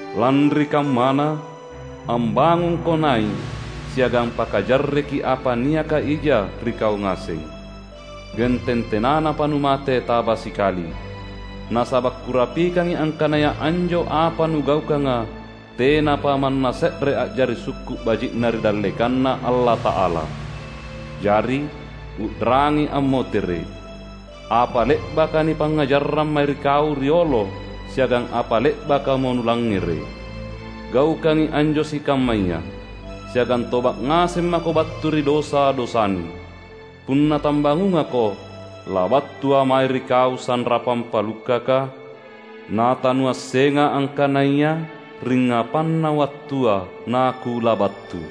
Lanri kammana, ambangungko nai’, siagang pakajarreki apa niaka ija ri kau ngaseng, genteng tenanapa numate taba sikali. Nasaba’ Kurapikangi angkanaya anjo apa nugaukanga tenapa manna se’re a’jari sukku’ baji’na ri dallekanNa Allata’ala. Jari, u’rangi ammotere’ apa le’baka nipangngajarrang mae ri kau riolo siagang apa le’bakamo nulangngere’. Gaukangi anjo sikammaya, siagang toba’ ngaseng mako battu ri dosa-dosanu. Punna tambangungako, labattuA’ mae ri kau sanrapang palukkaka; natanuassenga angkanaya ringngapanna wattua naKulabattu.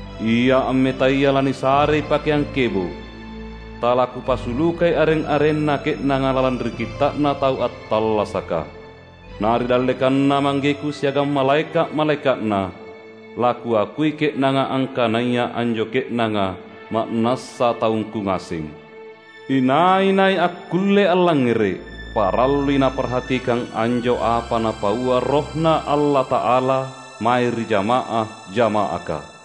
Ia ammetaya lanisarei pakeang kebo’. TalaKupasulukai areng-arenna ke’nanga lalang ri Kitta’na Tau Attallasaka. Na ri dallekanNa ManggeKu siagang malaeka’-malaeka’Na, laKuakui ke’nanga angkanaya anjo ke’nanga ma’nassa taungKu ngaseng. Inai-nai akkulle allangngere’, parallui naparhatikang anjo apa Napaua RohNa Allata’ala mae ri jama’ah-jama’aka!"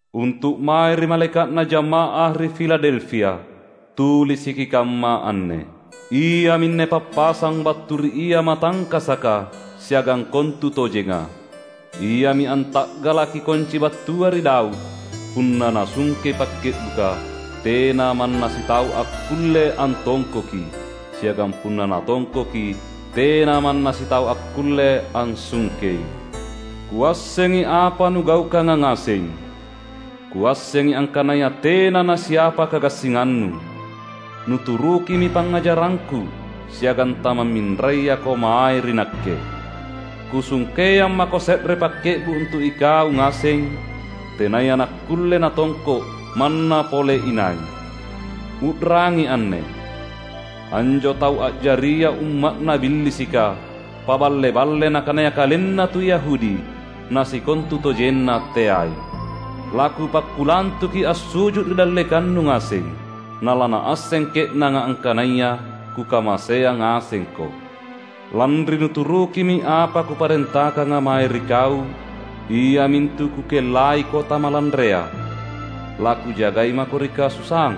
"Untu’ mae ri malaeka’na jamaah ri Filadelfia, tulisiki kamma anne: Iaminne pappasang battu ri Ia matangkasaka siagang kontutojenga. Iami anta’galaki konci battua ri Daud; punna Nasungkei pakke’buka, tena manna sitau akkulle antongkoki, siagang punna Natongkoki, tena manna sitau akkulle ansungkei. Kuassengi apa nugaukanga ngaseng. Kuassengi angkanaya tena nasiapa kagassingannu; nuturukimi pangngajarangKu siagang tamamminrayako mae ri Nakke. Kusungkeang mako se’re pakke’bu’ untu’ ikau ngaseng, tenaya nakkulle natongko’ manna pole inai. U’rangi anne: Anjo tau a’jaria umma’na Billisika, paballe-balle nakanaya kalenna tu Yahudi, na sikontutojenna teai, laKupakkulantuki assu’ju’ ri dallekannu ngaseng. Nalanaasseng ke’nanga angkanaya Kukamaseang ngasengko. Lanri nuturukimi apa Kuparentakanga mae ri kau, iamintu Kukellaiko tamalanrea, laKujagai mako ri kasusaang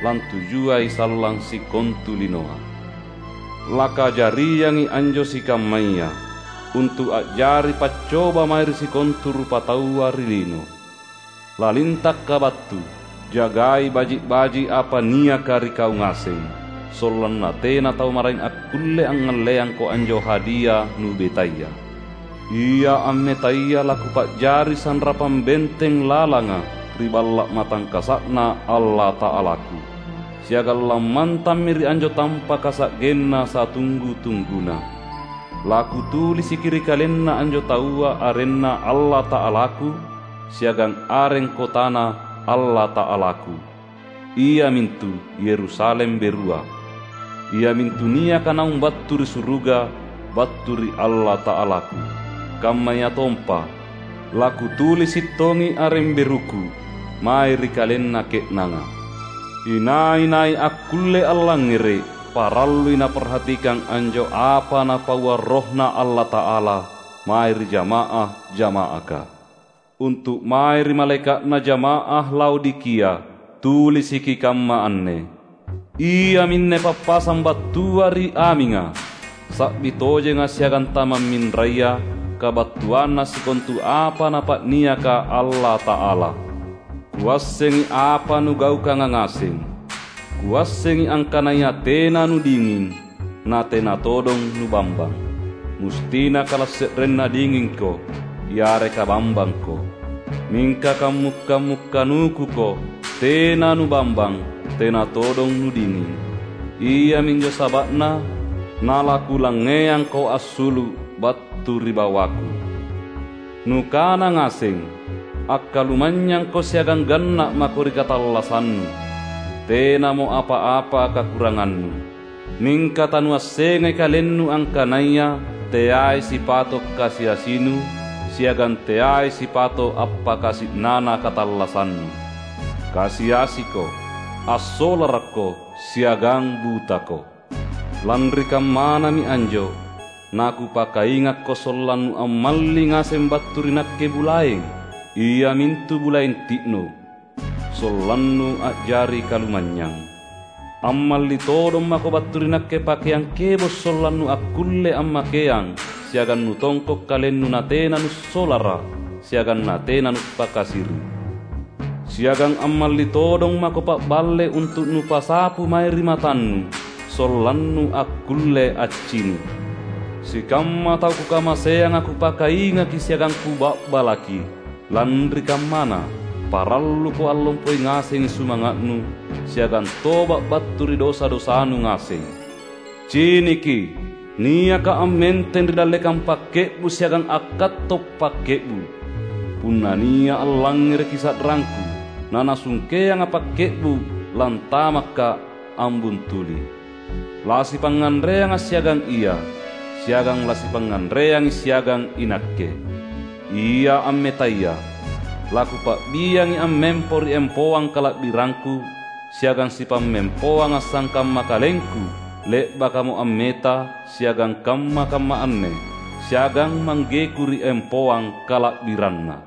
lantujuai sallang sikontu linoa. Lakajariangi anjo sikammaya, untu’ a’jari paccoba mae ri sikontu rupataua ri lino. LalintakKa’ battu! Jagai baji’-baji’ apa niaka ri kau ngaseng, sollanna tena tau maraeng akkulle angngalleangko anjo hadia nubetaya. Ia ammetaya laKupa’jari sanrapang benteng lalanga ri Balla’ Matangkasa’Na Allata’alaKu, siagang lammantammi ri anjo tampaka sa’genna satunggu-tungguna. LaKutulisiki ri kalenna anjo taua arenNa Allata’alaKu, siagang areng kotaNa Allata’alaKu — iamintu Yerusalem berua, iamintu niaka naung battu ri suruga, battu ri Allata’alaKu. Kammayatompa, laKutulisi’ tongi areng beruKu mae ri kalenna ke’nanga. Inai-nai akkulle allangngere’, parallui naparhatikang anjo apa Napaua RohNa Allata’ala mae ri jama’ah-jama’aka!" "Untu’ mae ri malaeka’na jama’ah Laodikia, tulisiki kamma anne: Iaminne pappasang battua ri Aminga, Sa’bi tojenga siagang tamamminraya, kabattuanna sikontu apa Napa’niaka Allata’ala. Kuassengi apa nugaukanga ngaseng; Kuassengi angkanaya tena nudinging, na tena todong nubambang. Mustina kalase’renna dingingko yareka bambangko! Mingka kammu’-kammu’ kanukuko: tena nubambang, tena todong nudinging. Iaminjo saba’na nalaKulangngeangko assulu’ battu ri bawaKu. Nukana ngaseng: Akkalumanynyangko siagang ganna’ mako ri katallassannu; tenamo apa-apa kakurangannu. Mingka tanuassengai kalennu angkanaya teai sipato’ kasi-asinu, siagang teai sipato’ appakasi’nana katallassannu. Kasi-asiko, assolarakko, siagang butako. Lanri kammanami anjo naKupakaingakko sollannu ammalli ngaseng battu ri Nakke bulaeng, iamintu bulaeng ti’no’, sollannu a’jari kalumanynyang. Ammalli todong mako battu ri Nakke pakeang kebo’ sollannu akkulle ammakeang siagang nutongko’ kalennu natena nussolara’ siagang natena nuppakasiri’. Siagang ammalli todong mako pa’balle untu’ nupasapu mae ri matannu, sollannu akkulle accini’. Sikamma tau Kukamaseanga Kupakaingaki siagang Kuba’balaki. Lanri kammana, paralluko allompoi ngasengi sumanga’nu, siagang toba’ battu ri dosa-dosanu ngaseng. Ciniki! NiakKa’ ammenteng ri dallekang pakke’bu’ siagang akkatto’ pakke’bu’. Punna nia’ allangngereki sa’rangKu, nanasungkeangA’ pakke’bu’, lantamakKa’ ambuntuli; lasipangnganreangA’ siagang ia, siagang lasipangnganreangi siagang iNakke. Ia ammetaya, laKupa’biangi ammempo ri empoang kala’birangKu siagang sipammempoangA’ sangkamma Kalengku le’bakamo ammeta siagang kamma-kamma anne siagang ManggeKu ri empoang kala’biranNa.